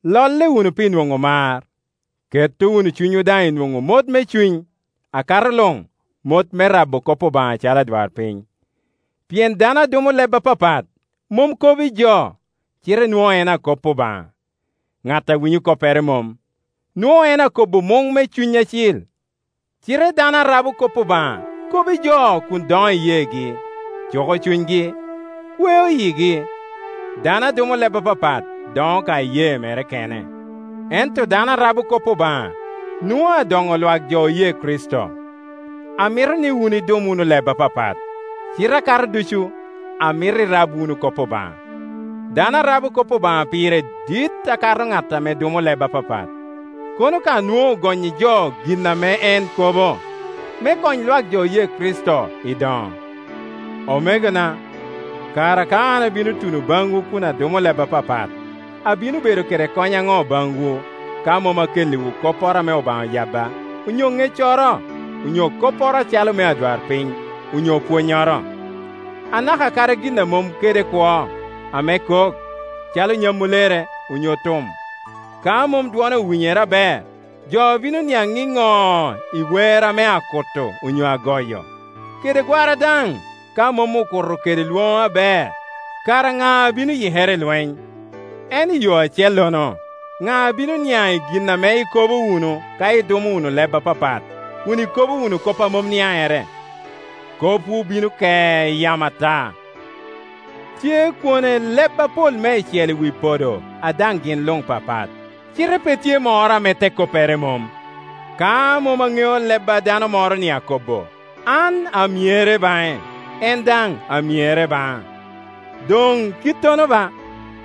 Lolle wunu pi nwoŋo mar; ketto wunu cunywu daŋ i nwoŋo mot me cuny, akato luŋ mot me rabo kop Obaŋa acalo adwarpiny. Pien dano a dumo leb apapat mom kobo i jo, cite nwoŋo en akop Obaŋa. Ŋat a winyo koppere mom; nwoŋo en akobo muŋ me Cuny Acil. Cite dano a rabo kop Obaŋa kobo i jo kun doŋo iyeegi, cuko cunygi, kweo yigi. Dano a dumo leb apapat doŋo ka iyee mere kene; ento dano a rabo kop Obaŋa nwoŋo adoŋo lwak jo oye Kricito. Amito ni wun idum wunu leb apapat, cite akato ducu amito irab wunu kop Obaŋa. Dano a rabo kop Obaŋa pire dit akato ŋat ame dumo leb apapat, kono ka nwoŋo ogonnyi jo gin ame en kobo, me kony lwak jo oye Kricito i doŋo. Omegona, kara ka an abino tuno baŋwu kun adumo leb apapat, abino bedo kede kony aŋo baŋwu, ka mom akelliwu kopporo ame Obaŋa oyabba, onyo ŋeccoro, onyo kopporo acalo mea adwarpiny, onyo pwonnyoro? Anaka kadi gin a mom kede kwo, ame kok, calo nyamulere onyo tum, ka mom dwone owinyere aber, jo bino niaŋ iŋo i wer ame akutto onyo agoyo? Kede gwara daŋ, ka mom okuto kede lwoŋo aber, kara ŋa abino yikere i lweny? En i yo acellono, ŋa abino niaŋ i gin ame ikobo wunu ka idumo wunu leb apapat, kun ikobo wunu kop a mom niaŋere? Kopwu bino ke i yamo ata. Tye kwone leb apol meicel i wi podo a daŋ gin luŋ papat, cite pe tye moro ame te koppere mom. Ka mom aŋeo leb a dano moro-ni akobo, an amyere baŋe, en daŋ amyere baŋa. Doŋ kittono ba,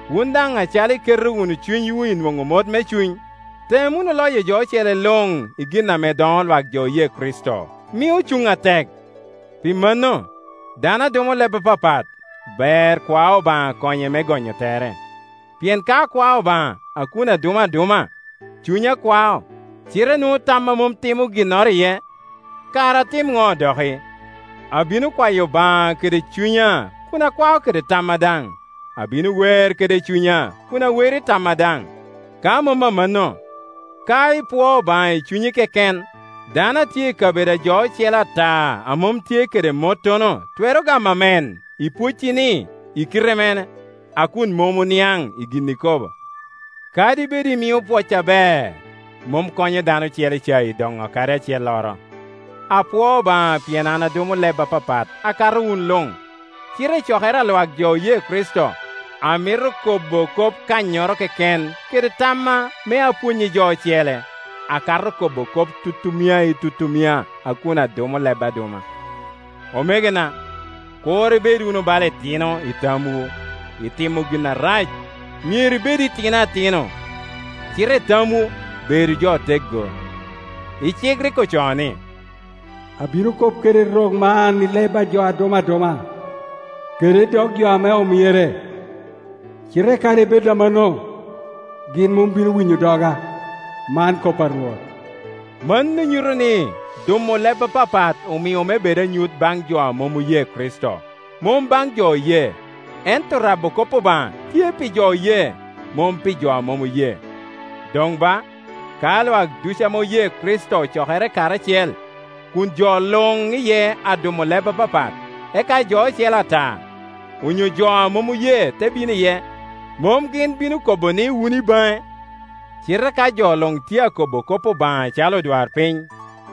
wun daŋ acalo iketo wunu cunywu i nwoŋo mot me cuny, tem wunu loyo jo ocele luŋ i gin ame doŋo lwak jo oye Kricito, mio cuŋ atek. Pi mano, dano a dumo leb apapat ber kwa Obaŋa konye me gonyo tere. Pien ka akwao Obaŋa a kun adumo aduma, cunya kwao, cite nwoŋo tamma mom timo ginnoro iye. Kara atim ŋo doki? Abino kwayo Obaŋa kede cunya kun akwao kede tamma daŋ; abino wer kede cunya kun awero i tamma daŋ. Ka mom amanno, ka ipwoo Obaŋa i cunyi keken, dano a tye i kabedo a jo ocele ata a mom tye kede mottono twero gamo “Amen” i pwoeci-ni i kite mene, a kun mom oniaŋ i gin ikobo? Kadi bed imio pwoc aber, mom konyo dano ocele ca i doŋo kadi acelloro. Apwoo Obaŋa pien an adumo leb apapat akato wun luŋ, cite i cokere a lwak jo oye Kricito amito kobo kop kannyoro keken kede tamma me apwony i jo ocele, akato kobo kop tutumia i tutumia a kun adumo leb aduma. Omegona, kur ibed wunu bala itino i tamwu. I timo gin arac myero ibedu itino atino, cite i tamwu bedu jo oteggo. I cik rik ocoo ni, “Abino kop kede rok man i leb a jo dumo aduma, kede i dog jo ame omyere; cite kadi bed amannono, gin mombino winyo doga, man kop a Rwot.” Mano nyuto ni dumo leb apapat omio me bed anyut baŋ jo a mom oye Kricito, mom baŋ jo oye, ento rabo kop Obaŋa tye pi jo oye, mom pi jo a mom oye. Doŋ ba, ka lwak ducu ame oye Kricito ocokere karacel kun jo luŋ iye adumo leb apapat, eka jo ocele ata, onyo jo a mom oye te bino iye, mom gin bino kobo ni wun i baŋe? Cite ka jo luŋ tye akobo kop Obaŋa acalo odwarpiny,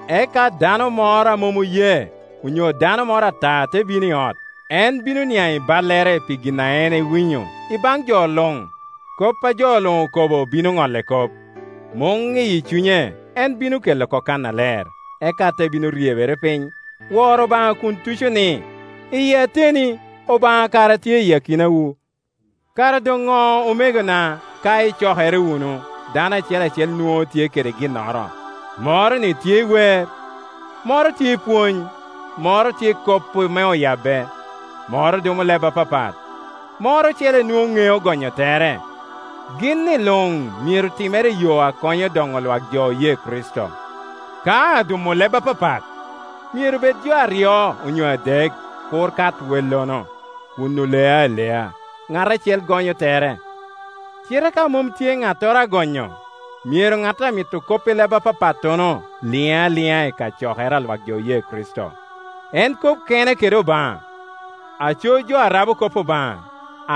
eka dano moro a mom oye, onyo dano moro ata te bino i ot, en bino niaŋ i ballere pi gin a en owinyo i baŋ jo luŋ; kopa jo luŋ okobo bino ŋolle kop, muŋ iyi cunye en bino kela oko kannaler, eka, te bino ryebere piny, woro Obaŋa kun tuco ni, “Iyi ateni, Obaŋa kara tye i akinawu.” Kara doŋ ŋo, omegona? Ka icokere wunu, dano acel acel nwoŋo tye kede ginnoro; moro tye i wer, moro tye i pwony, moro tye i kop ame oyabbe, moro dumo leb apapat, moro ocele nwoŋo ŋeo gonyo tere. Gin-ni luŋ myero timere i yo a konyo doŋo lwak jo oye Kricito. Ka adumo leb apapat, myero bed jo aryo onyo adek, kur kat wellono, kun oleo alea, ŋat acel gonyo tere. Cite ka mom tye ŋattoro a gonyo, myero ŋat a mito kop i leb apapatono liŋ aliŋa i cokere a lwak jo oye Kricito, en kob kene kede Obaŋa. Aco jo a rabo kop Obaŋa,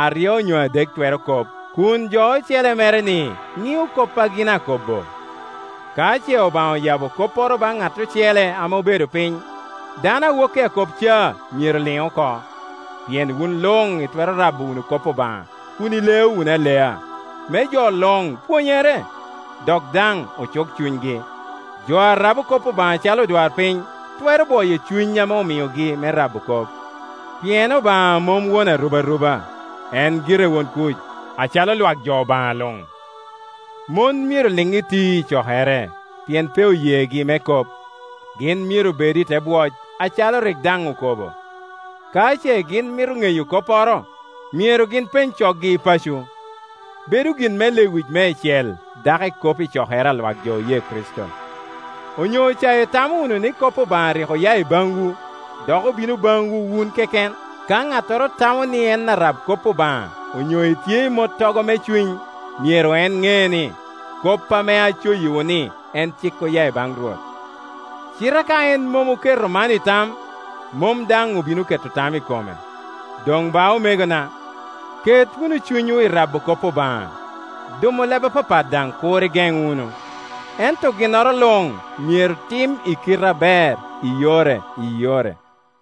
aryo onyo adek twero kop, kun jo ocele mere-ni ŋio kop a gin akobbo. Ka ce Obaŋa oyabo kopporo baŋ ŋat ocele ame obedo piny, dano a woki akop ca myero liŋ oko. Pien wun luŋ itwero rabo wunu kop Obaŋa kun ileo wunu alea, me jo luŋ pwonyere, dok daŋ ocuk cunygi. Jo a rabo kop Obaŋa acalo odwarpiny twero bwoyo cuny ame omiogi me rabo kop; pien Obaŋa mom won arubaruba, en gire won kuc. Acalo lwak jo Obaŋa luŋ, mon myero liŋ iti i cokere. Pien pe oyegi me kop; gin myero bed i te bwoc, acalo cik daŋ okobo. Ka ce gin mito ŋeyo kopporo, myero gin peny coggi i paco. Bedo gin me lewic meicel, dako ikop i cokere a lwak jo oye Kricito. Onyo ca itamo wunu ni kop Obaŋa rik oya i baŋwu, dok obino baŋwu wun keken? Ka ŋattoro tamo ni en arab kop Obaŋa onyo etye i mottogo me cuny, myero en ŋe ni, kop ame acoyiwu ni en cik oya i baŋ Rwot. Cite ka en mom oketo man i tam, mom daŋ obino keto tam i kome. Doŋ ba, omegona, ket wunu cunywu i rabo kop Obaŋa, dumo leb apapat daŋ kur igeŋ wunu. Ento ginnoro luŋ myero tim i kite aber, i yore i yore.